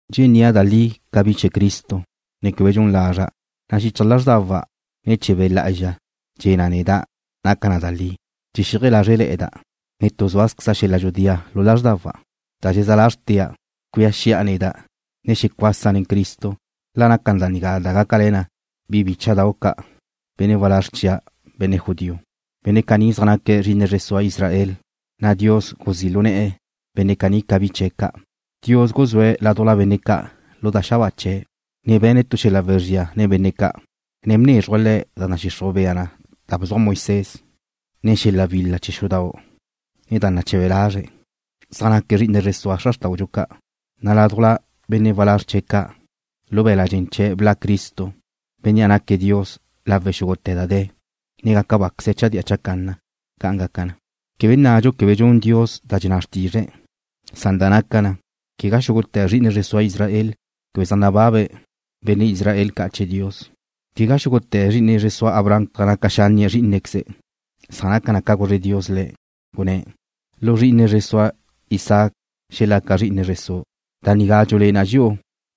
Dxennía' da li ca bi chee̱ Cristo, ne quebe dxun lazra', na' xichaj lázrdawa' ne̱ chee̱ Be' Lá'azxa dxe̱ na neda' naca na da li. Dxexíaje lázrele̱'e̱da', ne tu zúazqueze xel-la dxudía lu lázrdawa', na' dxezá lázrtea' cuía xi'a neda', ne xecuasa' nen Cristo, la naca da nigá da gácale̱ na bi bícha'dau' ca', benne' walázr chia', benne' judío. Benne' caní zaj naque̱' zri'ine zre sua Israel, na' Dios guzí' lu ne̱'e̱ benne' caní ca bi chee̱' ca'. Dios guzúe̱' ládujla benne' ca' lu da xabáa chee̱', ne be̱ne̱' tu xel-la wezría nen benne' ca', ne bnézruje̱' le̱' da nadxixruj bea na da bzuaj Moisés, ne xel-la wil-la chee̱ xudau', ne da nache̱be lazre̱'. Zaj naque̱' zri'ine zre zua xra xrtáudxu ca', na' ládujla benne' walázr chee̱' ca', lu be̱la' dxen chee̱' bla' Cristo, Bénnea' naque̱' Dios lawe' xúgute̱ da de̱, ne gaca báqueze̱' chadía chacanna. ¡Ca' gaca na! Quebe nnadxu quebe dxun Dios da dxenná xrtizre̱', san da naca na, quegá xúgute̱ zri'ine zre sua Israel zaj nababa benne' Israel ca' chee̱ Dios. Quegá xúgute̱ zri'ine zre sua Abraham zaj naca xánnie̱' zrí'inequeze̱', san naca na ca guzre Dios le̱', gunné̱': “Lu zri'ine zre sua Isaac xelaca zri'ine zre su'.” Da nigá dxulé'e na dxi'u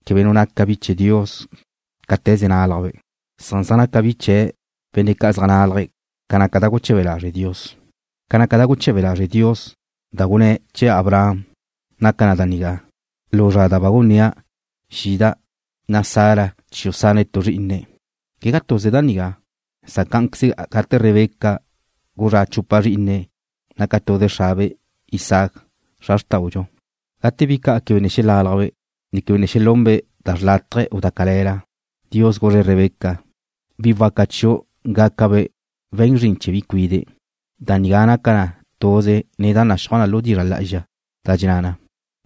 quebe nu naca bi chee̱ Dios cáte̱ze nálajbe', san zaj naca bi chee̱' benne' ca' zaj nálaje̱' ca naca da guche̱be lazre' Dios. Ca naca da guche̱be lazre' Dios da gunné̱' chee̱ Abraham naca na da nigá: Lu zra da ba gunnía' xida', na' Sara chiu' sane̱' tu zrí'inu'. Quegá tuze da nigá, san cá'anqueze gate Rebeca guzrá' chupa zrí'ine̱' naca tuze xrabe', Isáac, xra xrtáudxu, ne gate bi ca' quebe ne xelálajbe', ne quebe ne xelunbe' da xrlátaje u da cale̱la, Dios guzre̱' Rebeca: “Bi waca chiu' gácabe' we̱n zrin chee̱ bi cuide'.” Da nigá naca na tuze nen da naxúaj lu dizra' lá'azxa, da dxenná na: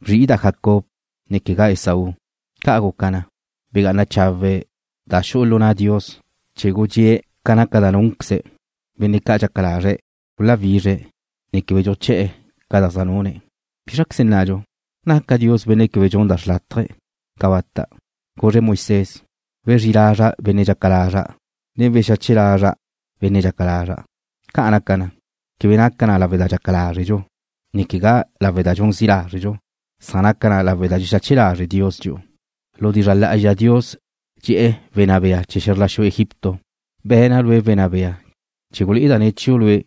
Bzri'ida' Jacob, ne quegá Esaú. Ca' guca na, begá'ana chawe' da xu'u lu na' Dios chee̱ gudxée̱' ca naca da núnqueze̱', benne' ca' dxaca lazre̱' guláwizre̱', ne quebe dxuché̱'e̱ ca da zaj nune̱'. ¿Bízraqueze nnadxu? ¿Naca Dios Benne' quebe dxun da xrlátaje? ¡Cabata'! Guzre̱' Moisés: “Wezrí lazra' benne' dxaca lazra', ne wexache lazra' benne' dxaca lazra'.” Ca' naca na, quebe naca lawe' da dxaca lázredxu, ne quegá lawe' da dxun zi' lázredxu, san naca na lawe' da dxexache lazre' Dios dxi'u. Lu dizra' lá'azxa Dios dxe̱'e̱ wenná bea chee̱ xe̱zr la xu Egipto: “Be̱na' lue' wenná bea chee̱ gulé'eda' ne̱ chiu' lue'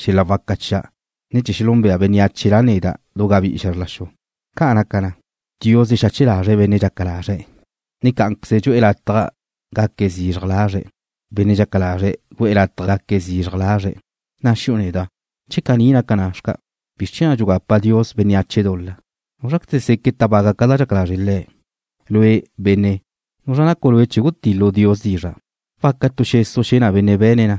xel-la waca chia', ne chee̱ xelúnbea bénneache La neda' du gabí'i xe̱zr la xu.” Ca' naca na, Dios dxexache lazre̱' benne' dxaca lazre̱', ne cá'anqueze dxu'e̱ lataj gaque̱' zizraj lazre' benne' dxaca lazre̱' gu'e̱ lataj gaque̱' zizraj lazre'. Na'a xi'u neda': Che caní naca na, ¿bizr chee̱ na' dxugapa Dios bénneache dul-la? ¿Núzraqueze seque' tábaga ca da dxaca lazre' Le̱'? Lue', benne', ¿nuzra nacu' lue' chee̱ gutil-lu' Dios dizra'? ¿Waca tu xesu' xe̱ na benne' be̱ne̱' le̱ na: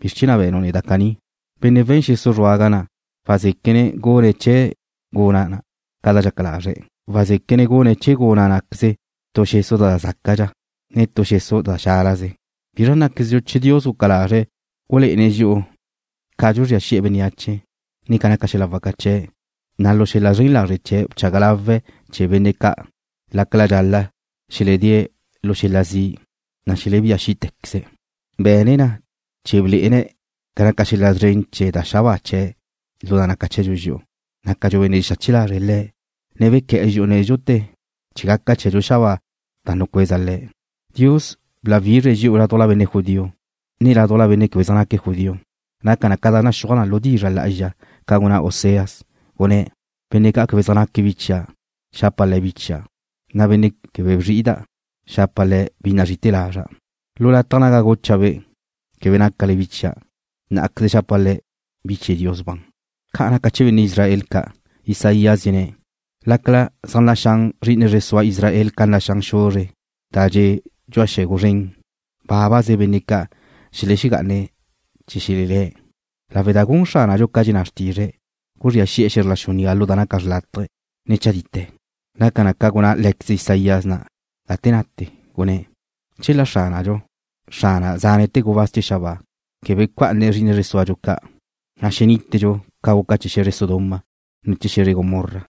¿Bizr chée̱ na' be̱nu' neda' caní? Benne' we̱n xesu' zruaga na' wazéquene̱' gune̱' chee̱ guna' na' ca dxaca lazre̱'. Wazéquene̱' gune̱' chee̱ guna' ná'queze tu xesu' da zácadxa, ne tu xesu' da xálaze. ¿Bizra nnáquezdxu che Dios guca lazre̱' gulé'ene̱' dxi'u ca dxuzría xi'e bénneache, ne ca naca xel-la waca chee̱', na' lu xel-la zren lazre' chee̱' bchaga lawe̱' chee̱ benne' ca' lácala dxal-la' xeledée̱' le̱' xel-la zi', na' xelebía xí'te̱queze̱'? Be̱ne̱' na chee̱ blé'ene̱' ca naca xel-la szren chee̱ da xabáa chee̱' lu da naca chee̱dxu dxi'u, nácadxu benne' dxexache lazre̱' Le̱', ne bequé̱'e̱ dxi'u nédxute̱ chee̱ gaca chee̱dxu xabáa na' da nucueza Le̱'. Dios bláwizre̱' dxi'u ládujla benne' judío, ne ládujla benne' quebe zaj naque̱' judío. Naca na ca naxúaj na lu dizra' lá'azxa ca gunná Oseas, gunné̱': Benne' ca' quebe zaj naque̱' bi chia', xapa' le̱' bi chia', na' benne' quebe bzri'ida', xapa' le̱' bi nazri'ite̱ lazra'. Lu lataj naga gucha'-be': Quebe nácale bi chia', ná'queze xapa' le̱' bi chee̱ Dios ban. Ca naca chee̱ benne' Israel ca', Isaías dxenné̱': “Lácala zaj naxán zri'ine zre sua Israel ca naxán xuzre' dxe' dxu'a tu xe̱gu zren, bábaze benne' ca' xelexegá'ane̱' chee̱ xelelé̱'”, lawe' da gun Xránadxu ca dxenná xrtizre̱', guzría xi'e̱ ze̱zr la xu nigá lu da naca xrlátaje, ne chadite. Naca na ca gunná lé̱queze Isaías na' gate nate, gunné̱': Chela Xránadxu, Xrana zánete̱ gubáz chee̱ xabáa, quebe bca'ane̱' zri'ine zre súadxu ca', na' xenítedxu ca guca chee̱ xe̱zre Sodoma, ne chee̱ xe̱zre Gomorra.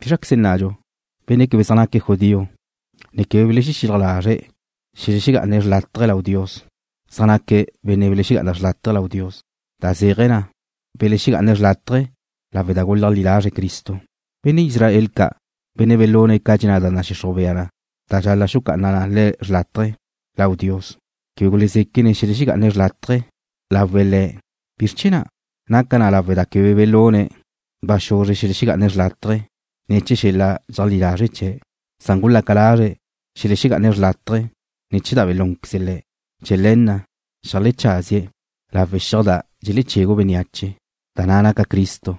¿Bízraqueze nnadxu? Benne' quebe zaj naque̱' judío, ne quebe belexexílaj lazre̱' xelexegá'ane̱' xrlátaje lau Dios, zaj naque̱' benne' belexegá'ane̱' xrlátaje lau Dios, da zéaje̱ na, belexegá'ane̱' xrlátaje lawe' da guleajlí lazre̱' Cristo. Benne' Israel ca', benne' belune̱' ca dxenná da nadxixruj bea na da dxal-la' xucá'ana na le̱' xrlátaje lau Dios, quebe gulezéquene̱' xelexegá'ane̱' xrlátaje lawe̱' Le̱'. ¿Bizr chee̱ na'? Naca na lawe' da quebe belune̱' ba xuzre xelexegá'ane̱' xrlátaje ne̱ chee̱ xel-la dxeajlí lazre' chee̱', san gulaca lazre̱' xelexegá'ane̱' xrlátaje ne̱ chee̱ da belúnqueze̱' le̱'. Chee̱ le̱ na' xeajlecházie̱' lawe' xiaj da dxelechegu bénneache, da na' naca Cristo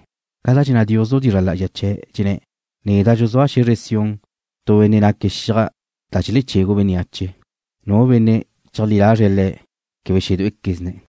ca da dxenná Dios lu dizra' lá'azxa chee̱', dxenné̱': Neda' dxuzúa' lu xe̱zre Sión tu benne' naque̱' xiaj da dxelechegu bénneache. Nu benne' cheajlí lazre̱' Le̱' quebe xedué'equezne̱'.